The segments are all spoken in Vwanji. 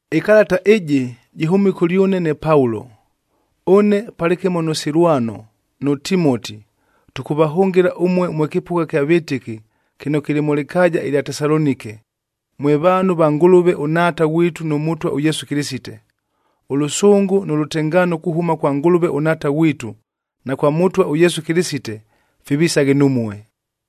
Ɨkalata ɨjɨ jɨhʉmile kʉlyʉne ne Paulo. Ʉne palɨkɨmo nʉ Silwanoa nʉ Timoti, tʉkʉvahʉngɨla ʉmue mwe kɨpʉgha kya vɨtɨki, kɨno kɨlɨ mʉ lɨkaaja ɨlya Tesalonike, mwe vaanhu va Ngʉlʉve ʉNhaata ghwitu nʉ Mʉtwa ʉYesu Kɨlɨsite. Ʉlʉsʉngʉ nʉ lʉtengaano kuhʉma kwa Ngʉlʉve ʉNhaata ghwitu, na kwa Mʉtwa ʉYesu Kɨlɨsite fivisaghe numue.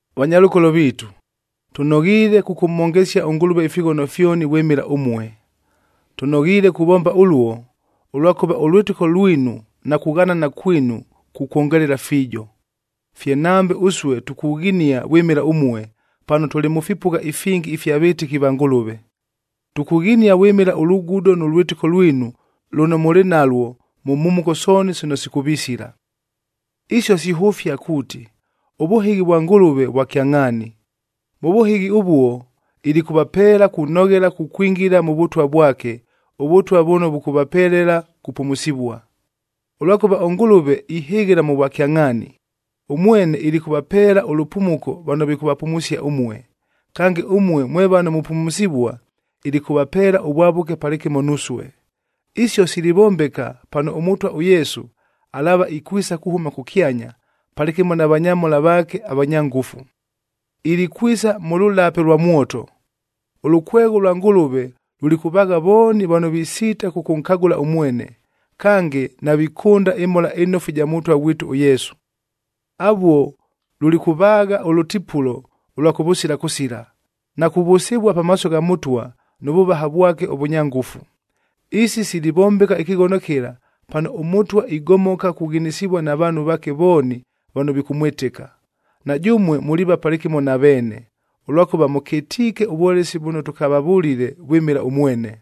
Vanyalʉkolo viitu, tʉnoghiile kʉkʉmhongesia ʉNgʉlʉve ifighono fyoni vwɨmɨla ʉmue. Tʉnoghiile kuvomba ʉluo, ʉlwakʉva ʉlwɨtɨko lwinu na kughanana kwinu kukwongelela fiijo. Fye nambe ʉsue tukughinia vwɨmɨla ʉmue, pano tʉlɨ mʉ fipʉgha ifingi ifya vɨtɨki va Ngʉlʉve. Tukughinia vwɨmɨla ʉlugudo nʉ lwɨtɨko lwinu lʉno mʉlɨ nalwo mʉ mhumuko sooni sino sikʉvisila. Isio sihʉfia kuuti, ʉvʉhɨghi vwa Ngʉlʉve vwa kyangʼhaani. Mʉ vʉhɨghi ʉvuo ilikʉvapeela kunoghela kukwingila mʉ Vʉtwa vwake, ʉVʉtwa vʉno vʉkʉvapelela kupumusivua. Ʉlwakʉva ʉNgʉlʉve ihɨghɨla mʉ vwakyangʼhaani: Ʉmwene ilikʉvapeela ʉlʉpumuko vano vikʉvapumusia ʉmue, kange ʉmue mwe vano mupumusivua, ilikʉvapeela ʉvwavʉke palɨkɨmo nusue. Isio silivombeka pano ʉMʉtwa ʉYesu, alaava ikwisa kuhʉma kʉkyanya palɨkɨmo na vanyamhola vaake avanya ngʉfu. Ilikwisa mʉ lʉlape lwa mwoto. Ʉlʉkwegho lwa Ngʉlʉve lulikʉvaagha vooni vano visiita kʉkʉnkagʉla ʉmwene, kange navikʉnda ɨMhola ɨNofu ɨja Mʉtwa ghwitu ʉYesu. Avuo lulikʉvaagha ʉlʉtipulo ʉlwa kʉvʉsila kʉsila, na kuvʉsɨvua pamaaso gha Mʉtwa, nʉ vʉvaha vwake ʉvʉnya ngʉfu. Isi silivombeka ɨkɨghono kɨla, pano ʉMʉtwa igomoka kughinisivua na vaanhu vaake vooni vano vikʉmwɨtɨka. Na jʉmue muliiva palɨkɨmo na veene, ʉlwakʉva mʉkɨtiike ʉvwolesi vʉno tʉkavavʉlile vwɨmɨla ʉmwene.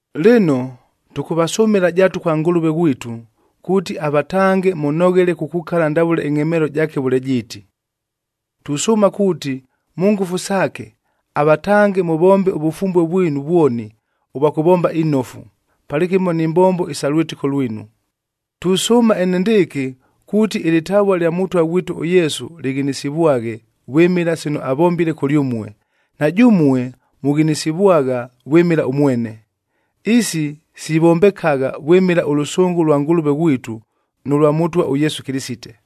Lɨno, tʉkʉvasʉmɨla jaatu kwa Ngʉlʉve ghwitu, kuuti avatange mʉnoghele kukukala ndavʉle ɨngʼhemeelo jaake vʉle jiiti. Tusʉʉma kuuti mʉ ngʉfu saake, avatange mʉvombe ʉvʉfumbue vwinu vwoni ʉvwa kʉvomba inofu, palɨkɨmo ni mbombo isa lwɨtɨko lwinu. Tusʉʉma enendɨɨkɨ, kuuti ɨlɨtavua lya Mʉtwa ghwitu ʉYesu lɨghinisivwaghe vwɨmɨla sino avombile kʉlyʉmue, na jʉmue mughinisivwagha vwɨmɨla ʉmwene. Isi sivombekagha vwɨmɨla ʉlʉsʉngʉ lwa Ngʉlʉve ghwitu, nʉ lwa Mʉtwa ʉYesu Kɨlɨsite.